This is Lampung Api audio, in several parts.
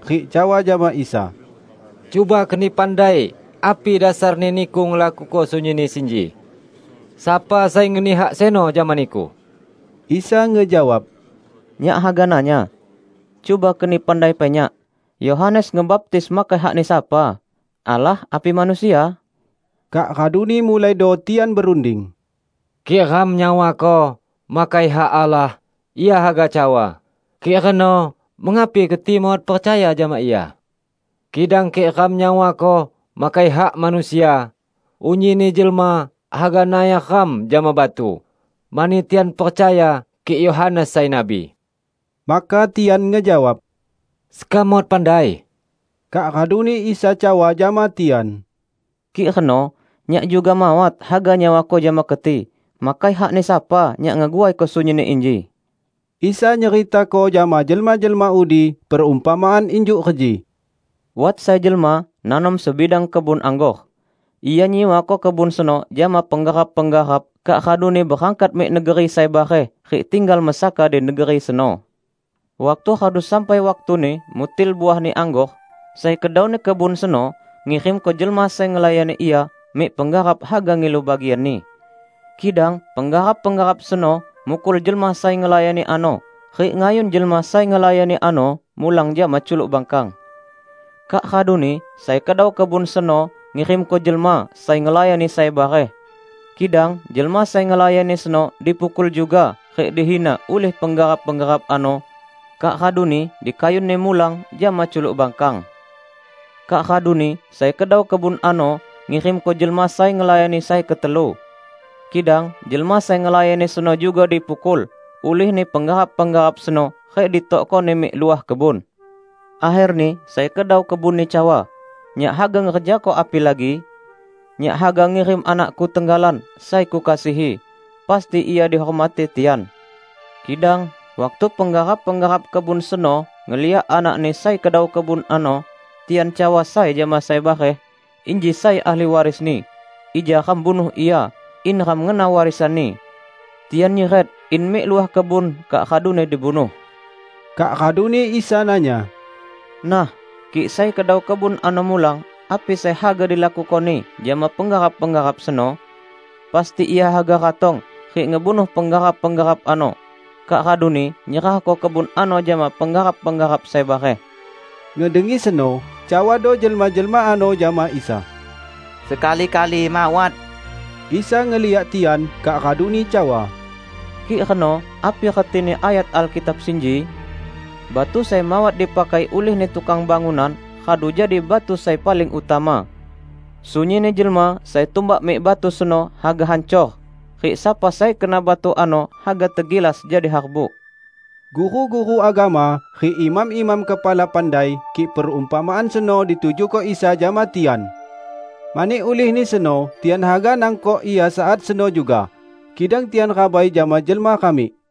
rik cawa jama Isa, "Cuba keni sekam pandai api dasarni Niku ngelakuko sunyinni sinji? Sapa sai ngeni hak seno jama Niku?" Isa ngejawab, "Nyak haga nanya. Cuba keni pandai pai Nyak, Yohanes ngebaptis makai hakni sapa? Allah api manusia?" Kak raduni mulaido tian berunding, "Kik ram nyawako, 'Makai hak Allah,' Ia haga cawa, 'Kik reno, mengapi keti mawat percaya jama ia?' Kidang kik ram nyawako, 'Makai hak manusia,' unyinni jelma haga nayar ram jama batu, mani tian percaya kik Yohanes sai nabi." Maka tian ngejawab, "Sekam mawat pandai." Kak raduni Isa cawa jama tian, "Kik reno Nyak juga mawat haga nyawako jama keti makai hakni sapa Nyak ngeguaiko sunyinni inji." Isa nyeritako jama jelma-jelma udi, perumpamaan injuk reji, "Wat sai jelma nanom sebidang kebun anggor. Ia nyiwako kebun seno jama penggarap-penggarap kak raduni berangkat mik negeri sai bareh rik tinggal mesaka di negeri seno. Waktu radu sampai waktuni mutil uahni anggor, sai kedauni kebun seno ngirimko jelma sai ngelayani ia mik penggarap haga ngilu bagianni. Kidang penggarap-penggarap seno mukul jelma sai ngelayani ano rik ngayun jelma sai ngelayani ano mulang jama culuk bangkang. Kak raduni sai kedau kebun seno ngirimko jelma sai ngelayani sai bareh; kidang jelma sai ngelayani seno dipukul juga rik dihina ulih penggarap-penggarap ano, kak raduni dikayunni mulang jama culuk bangkang. Kak raduni sai kedau kebun ano ngirimko jelma sai ngelayani sai ketelu. Kidang jelma sai ngelayani seno juga dipukul ulihni penggarap-penggarap seno rik ditokkoni mik luah kebun. Akherni sai kedau kebunni cawa, 'Nyak haga ngerjako apilagi? Nyak haga ngirim anakku tenggalan sai kukasihi. Pasti ia dihormati tian!' Kidang waktu penggarap-penggarap kebun seno ngeliak anakni sai kedau kebun ano, tian cawa sai jama sai bareh, 'Inji sai ahli warisni. Ija ram bunuh ia, in ram ngena warisanni.' Tian nyiret in mik luah kebun kak raduni dibunuh." Kak raduni Isa nanya, "Nah, kik sai kedau kebun ano mulang, api sai haga dilakukoni jama penggarap-penggarap seno? Pasti ia haga ratong rik ngebunuh penggarap-penggarap ano, kak raduni nyerahko kebun ano jama penggarap-penggarap sai bareh." Ngedengi seno, cawado jelma-jelma ano jama Isa, "Sekali-kali mawat!" Isa ngeliak tian kak raduni cawa, "Kik reno, api retini ayat Alkitab sinji? 'Batu sai mawat dipakai ulihni tukang bangunan, radu jadi batu sai paling utama.' Sunyinni jelma sai tumbak mik batu seno haga hancor; rik sapa sai kena batu ano haga tegilas jadi harbuk." Guru-guru agama rik imam-imam kepala pandai kik perumpamaan seno ditujuko Isa jama tian. Mani ulihni seno tian haga nangkok Ia saat seno juga, kidang tian rabai jama jelma ramik.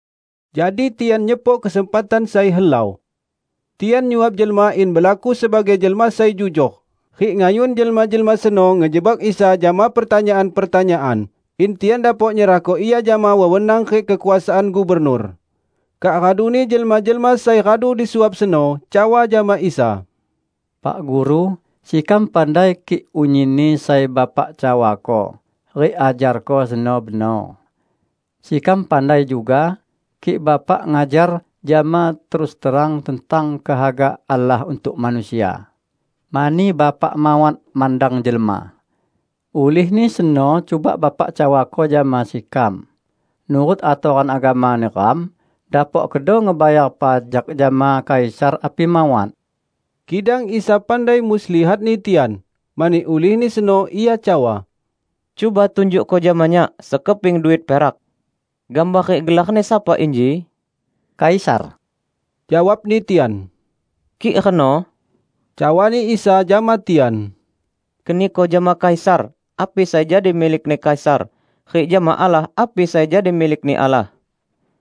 Jadi tian nyepok kesempatan sai helau. Tian nyuap jelma in belaku sebagai jelma sai jujor, rik ngayun jelma-jelma seno ngejebak Isa jama pertanyaan-pertanyaan, in tian dapok nyerahko Ia jama wewenang rik kekuasaan gubernur. Kak raduni jelma-jelma sai radu disuap seno cawa jama Isa, "Pak Guru, sekam pandai kik unyinni sai Bapak cawako rik ajarko seno benor. Sekam pandai juga kik Bapak ngajar jama terus terang tentang kehaga Allah untuk manusia, mani Bapak mawat mandang jelma. Ulihni seno cuba Bapak cawako jama sekam, nurut atoran agama neram, dapok kedo ngebayar pajak jama Kaisar api mawat?" Kidang Isa pandai muslihatni tian. Mani ulihni seno Ia cawa, "Cuba tunjukko jama Nyak sekeping duit perak. Gambar rik gelarni sapa inji?" "Kaisar!" jawabni tian. "Kik reno," cawani Isa jama tian, "keniko jama Kaisar, api sai jadi milikni Kaisar rik jama Allah api sai jadi milikni Allah."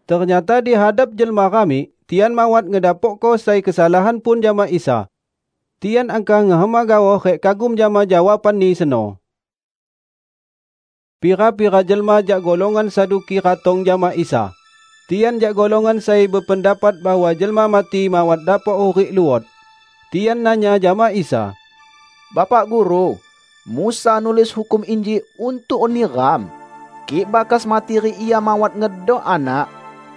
Ternyata di hadap jelma ramik tian mawat ngedapokko sai kesalahan pun jama Isa. Tian angkah ngehema gaoh rik kagum jama jawaban-Ni seno. Pira-pira jelma jak golongan Saduki ratong jama Isa. (Tian jak golongan sai bependapat bahwa jelma mati mawat dapok hurik luot.) Tian nanya jama Isa, "Bapak Guru, Musa nulis hukum inji untuk neram: Kik bakas mati rik ia mawat ngedok anak,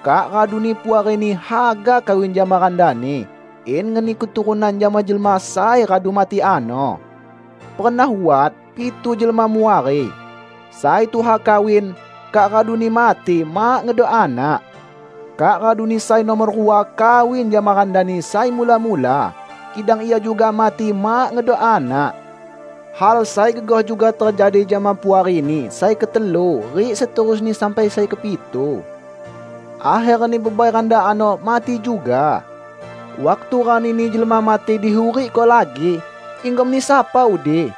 kak raduni puarini haga kawin jama randani in ngeni keturunan jama jelma sai radu mati ano. Pernah wat pitu jelma muari. Sai tuha kawin, kak raduni mati mak ngedok anak. Kak raduni sai numor rua kawin jama randani sai mula-mula, kidang ia juga mati mak ngedok anak. Hal sai gegoh juga tejadi jama puarini sai ketelu rik seterusni sampai sai kepitu. Akherni bebai randa ano mati juga. Waktu ranini jelma mati dihurikko lagi, inggomni sapa udi?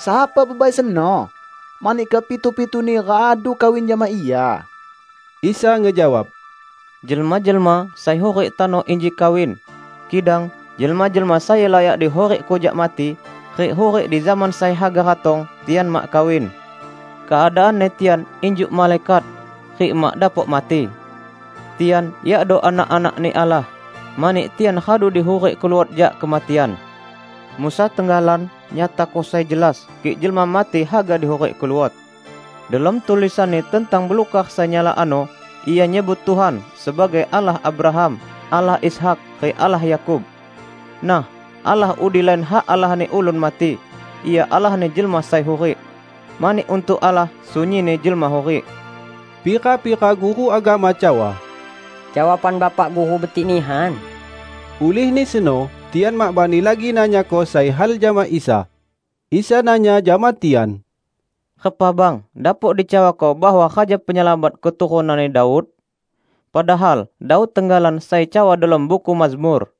Sapa bebai seno? Mani kepitu-pituni radu kawin jama ia." Isa ngejawab, "Jelma-jelma sai hurik tano inji kawin, kidang jelma-jelma sai layak dihurikko jak mati, rik hurik di zaman sai haga ratong, tian mak kawin. Keadaanni tian injuk malaikat, rik mak dapok mati. Tian yakdo anak-anak-Ni Allah, mani tian radu dihurikko luot jak kematian. Musa tenggalan nyatako sai jelas kik jelma mati haga dihurikko luot. Delom tulisanni tentang belukar sai nyala ano ia nyebut Tuhan sebagai 'Allah Abraham, Allah Ishak rik Allah Yakub'. Nah, Allah udi lain hak Allahni ulun mati! Ia Allahni jelma sai hurik! Mani untuk Allah, sunyinni jelma hurik." Pira-pira guru agama cawa, "Jawaban Bapak Guru betik nihan." Ulihni seno tian mak bani lagi nanyako sai hal jama Isa. Isa nanya jama tian, "Repa bang dapok dicawako bahwa Raja Penyelamat keturunanni Daud? Padahal Daud tenggalan sai cawa delom buku Mazmur,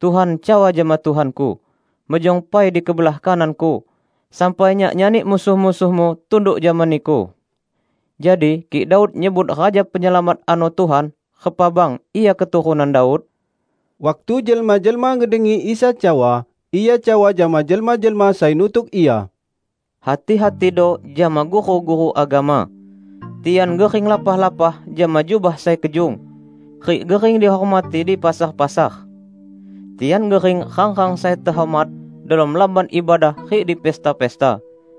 'Tuhan cawa jama Tuhanku: Mejong pai di kebelah kanan-Ku, sampai Nyak nyani musuh-musuh-Mu tunduk jama Niku.' Jadi kik Daud nyebut Raja Penyelamat ano 'Tuhan', repa bang Ia keturunan Daud?" Waktu jelma-jelma ngedengi Isa cawa, Ia cawa jama jelma-jelma sai nutuk Ia, "Hati-hatido jama guru-guru agama. Tian gering lapah-lapah jama jubah sai kejung, rik gering dihormati di pasar-pasar. Tian gering rang-rang sai tehormat delom lamban ibadah rik di pesta-pesta.